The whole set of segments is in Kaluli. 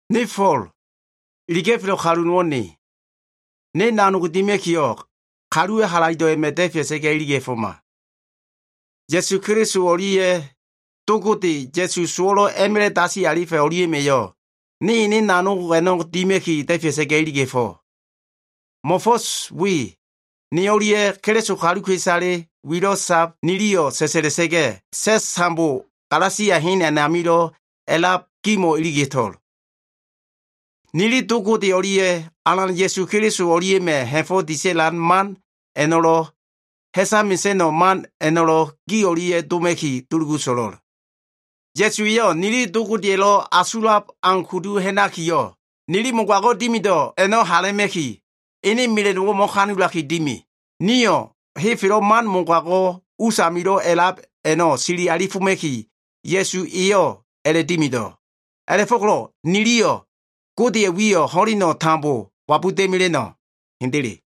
Ne Fo꞉l, iliga꞉felo꞉ kalu nowo꞉ ne. Ne nanog dima꞉kiyo꞉, kaluwa꞉ halaido꞉ a꞉ma꞉ da꞉fea꞉sa꞉ga꞉ iliga꞉foma. Ya꞉su Keliso o꞉lia꞉ Do Gode, Ya꞉su sowo꞉lo꞉ a꞉ma꞉la꞉ dasi alifa꞉ a꞉no꞉lia꞉ma꞉yo꞉ ne ene nanog a꞉no꞉ dima꞉ki da꞉fea꞉sa꞉ga꞉ iliga꞉fo꞉. Mo꞉fo꞉s we ne o꞉lia꞉ Keliso kaluka꞉isale wilo꞉ sab niliyo꞉ sa꞉sa꞉la꞉sa꞉ga꞉, sa꞉s tambo Galasia hen a꞉namilo꞉ a꞉lab gimo꞉ iliga꞉to꞉l. Nili Do Gode o꞉lia꞉ Alan Ya꞉su Keliso o꞉lia꞉ma꞉ ha꞉fo꞉ disa꞉lan man a꞉no꞉lo꞉, ha꞉sa mesa꞉no꞉ man a꞉no꞉lo꞉ gi o꞉lia꞉ doma꞉ki dulugu so꞉lo꞉l. Ya꞉su eyo꞉ nili Do Godeya꞉lo꞉ asulab au kudu ha꞉nakiyo꞉, nili mogago꞉ dimido꞉ a꞉no꞉ hala꞉ma꞉ki, ene mela꞉no꞉wo꞉ mo꞉kanulaki dimi. Nio꞉ henfelo꞉ man mogago꞉ usamilo꞉ a꞉lab a꞉no꞉ sili alifoma꞉ki, Ya꞉su eyo꞉ a꞉la꞉dimido꞉. A꞉la꞉fo꞉ko꞉lo꞉ niliyo꞉ Godeya꞉ wiyo꞉ ho꞉leno꞉ tambo wabuda꞉mela꞉no꞉. Hendele.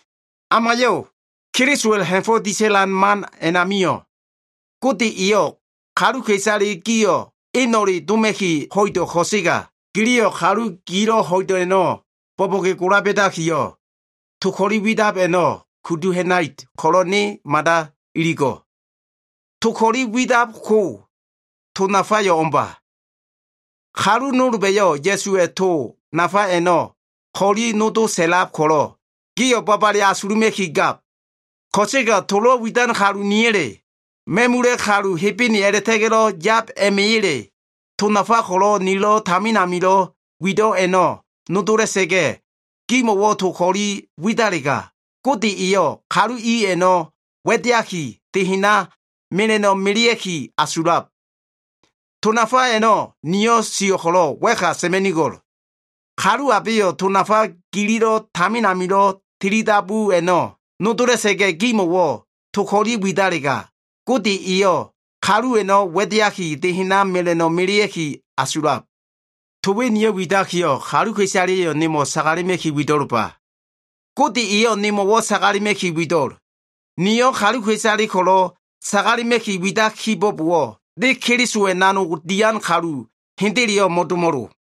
Amayo꞉! Kelisowa꞉lo꞉ ha꞉fo꞉ disa꞉lan man a꞉namio꞉, Gode eyo꞉ kaluka꞉isale gio꞉ eno꞉le doma꞉ki ho꞉ido꞉ ko꞉sega, giliyo꞉ kalu gilo꞉ ho꞉ido꞉ a꞉no꞉ bo꞉bo꞉ge gola ba꞉dakiyo꞉, to ko꞉li widab a꞉no꞉ kudu ha꞉nait ko꞉lo꞉ ne mada iligo꞉. To ko꞉li a꞉widab ko, to nafaleyo꞉ o꞉mba. Kalu nolba꞉yo꞉ Ya꞉suwa꞉ to nafa a꞉no꞉ ko꞉li nodo sa꞉lab ko꞉lo꞉, gio꞉ babale asuluma꞉ki gab. Ko꞉sega tolo꞉ widan kalu niya꞉le, ma꞉mula꞉ kalu Hebene a꞉la꞉ta꞉ga꞉lo꞉ yab a꞉ma꞉ya꞉le, to nafa ko꞉lo꞉ nilo꞉ tamin amilo꞉ wido꞉ a꞉no꞉ nodola꞉sa꞉ga꞉, gimo꞉wo꞉ to ko꞉li a꞉widalega, Gode eyo꞉ kalu i a꞉no꞉ wa꞉deaki, de hena mela꞉no꞉ melea꞉ki asulab. To nafa a꞉no꞉ niyo꞉ sio꞉ ko꞉lo꞉ wa꞉ka sa꞉ma꞉nigo꞉l. Kalu abeyo꞉ to nafa gililo꞉ tamin amilo꞉ tilidabu a꞉no꞉ nodola꞉sa꞉ga꞉, gimo꞉wo꞉ to ko꞉li a꞉widalega, Gode eyo꞉ kalu a꞉no꞉ wa꞉deaki de hena mela꞉no꞉ mesea꞉ki asulab. To we niyo꞉ widakiyo꞉, kaluka꞉isaleya꞉yo꞉ nemo꞉ sagalema꞉ki wido꞉lba. Gode eyo꞉ nemo꞉wo꞉ sagalema꞉ki wido꞉l. Niyo꞉ kaluka꞉isale ko꞉lo꞉ sagalema꞉ki widai kibo꞉bowo꞉, ne Kelisowa꞉ nanogdo꞉ dian kalu hendeleyo꞉ mo꞉domo꞉lo.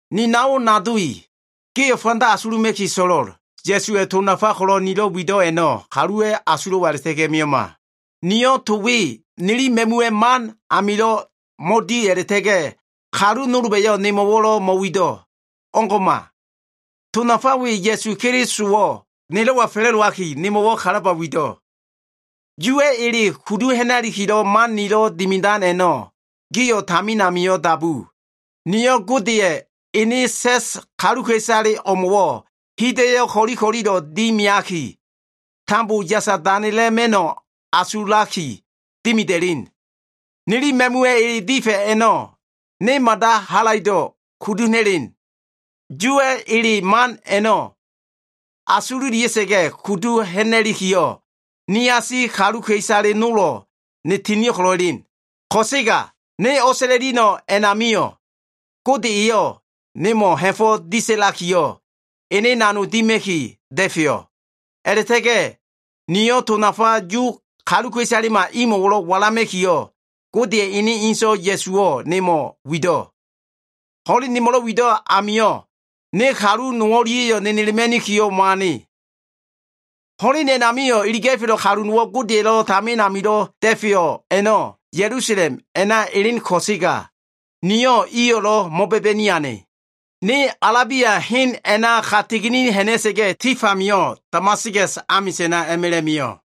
Ni nao nado i, gio꞉ fanda asuluma꞉ki so꞉lo꞉l. Ya꞉suwa꞉ to nafale ko꞉lo꞉ nilo꞉ wido꞉ a꞉no꞉ kaluwa꞉ asulo꞉wa a꞉la꞉ta꞉ga꞉ mio꞉ma. Niyo꞉ to we nili ma꞉muwa꞉ man a꞉namilo꞉ mo꞉di a꞉la꞉ta꞉ga꞉, kalu nolba꞉yo꞉lo꞉ nemo꞉wo꞉ mo꞉wido꞉. O꞉ngo꞉ma. To nafa we Ya꞉su Kelisowo꞉ nelo꞉wa fa꞉la꞉dowaki, nemo꞉wo꞉ kalaba wido꞉. Yuwa꞉ ele kudu ha꞉na꞉likilo꞉ man nilo꞉ dimidan a꞉no꞉ gio꞉ tamin amio꞉ dabu. Niyo꞉ Godeya꞉ ene sa꞉s kaluka꞉isale o꞉mo꞉wo꞉ hida꞉yo꞉ ko꞉li ko꞉lilo꞉ dimiaki, tambo yasa danela꞉ma꞉no꞉ asulaki dimida꞉len. Nili ma꞉muwa꞉ ele difa꞉ a꞉no꞉ ne mada halaido꞉ kudu ha꞉na꞉len. Yuwa꞉ ele man a꞉no꞉ asululia꞉sa꞉ga꞉ kudu ha꞉na꞉likiyo꞉, niasi kaluka꞉isale nolo꞉ ne tinio꞉ ko꞉lo꞉ elen. Ko꞉sega, ne o꞉sa꞉la꞉lia꞉no꞉ a꞉namio꞉, Gode eyo꞉ nemo꞉ ha꞉fo꞉ disa꞉lakiyo꞉, ene nanog dima꞉ki da꞉feyo꞉. A꞉la꞉ta꞉ga꞉ niyo꞉ to nafa Yu kaluka꞉isalema imo꞉wo꞉ walama꞉kiyo꞉, Godeya꞉ ene inso꞉ Ya꞉suwo꞉ nemo꞉ wido꞉. Ho꞉len nemo꞉lo꞉ wido꞉ amio꞉, ne kalu no o꞉lia꞉yo꞉ nenelema꞉nikiyo꞉ mo꞉ane. Ho꞉len a꞉namio꞉, iliga꞉felo꞉ kalu Godeya꞉lo꞉ tamin amilo꞉ da꞉feyo꞉ a꞉no꞉ Ya꞉lusalem elen ko꞉sega, niyo꞉ iyo꞉lo꞉ mo꞉ba꞉ba꞉ni ane. Ne Alabia hen a꞉naka tigini ha꞉na꞉sa꞉ga꞉, tif amio꞉ Damaskas amisa꞉na a꞉ma꞉la꞉ mio꞉.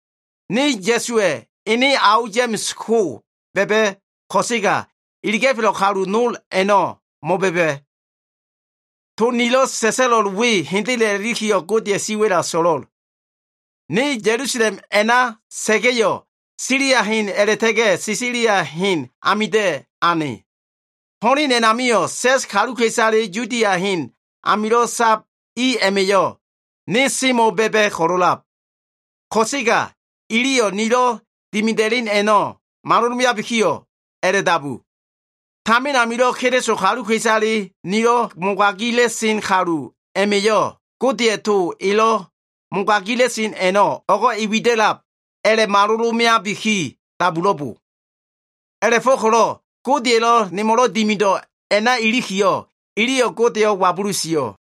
Ne Ya꞉suwa꞉ ene ao, Ya꞉ma꞉s ko꞉ ba꞉ba꞉ ko꞉sega, iliga꞉felo꞉ kalu nol a꞉no꞉ mo꞉ba꞉ba꞉. To nilo꞉ sa꞉sa꞉lo꞉l we hendele a꞉la꞉likiyo꞉, Godeya꞉ siwa꞉la so꞉lo꞉l. Ne Ya꞉lusalem a꞉na sa꞉ga꞉yo꞉, Silia hena a꞉la꞉ta꞉ga꞉ Silisia hen a꞉namida꞉ ane. Ho꞉len a꞉namio꞉, sa꞉s kaluka꞉isale Yudia hen amilo꞉ sab i a꞉ma꞉yo꞉ ne semo꞉ ba꞉ba꞉ ko꞉lo꞉lab. Ko꞉sega iliyo꞉ nilo꞉ dimida꞉len a꞉no꞉ malolabiki a꞉la꞉dabu, “Tamin amilo꞉ Keliso kaluka꞉isale nilo꞉ mogagila꞉sen kalu a꞉ma꞉yo꞉, Godeya꞉ to elo꞉ mogagila꞉sen a꞉no꞉ o꞉go꞉ e wida꞉lab” a꞉la꞉malolo꞉ meabiki dabulo꞉bo. A꞉la꞉fo꞉ko꞉lo꞉ Godeya꞉lo꞉ nemo꞉lo꞉ dimido꞉ a꞉na ilikiyo꞉, iliyo꞉ Godeyo꞉ wabulu sio꞉.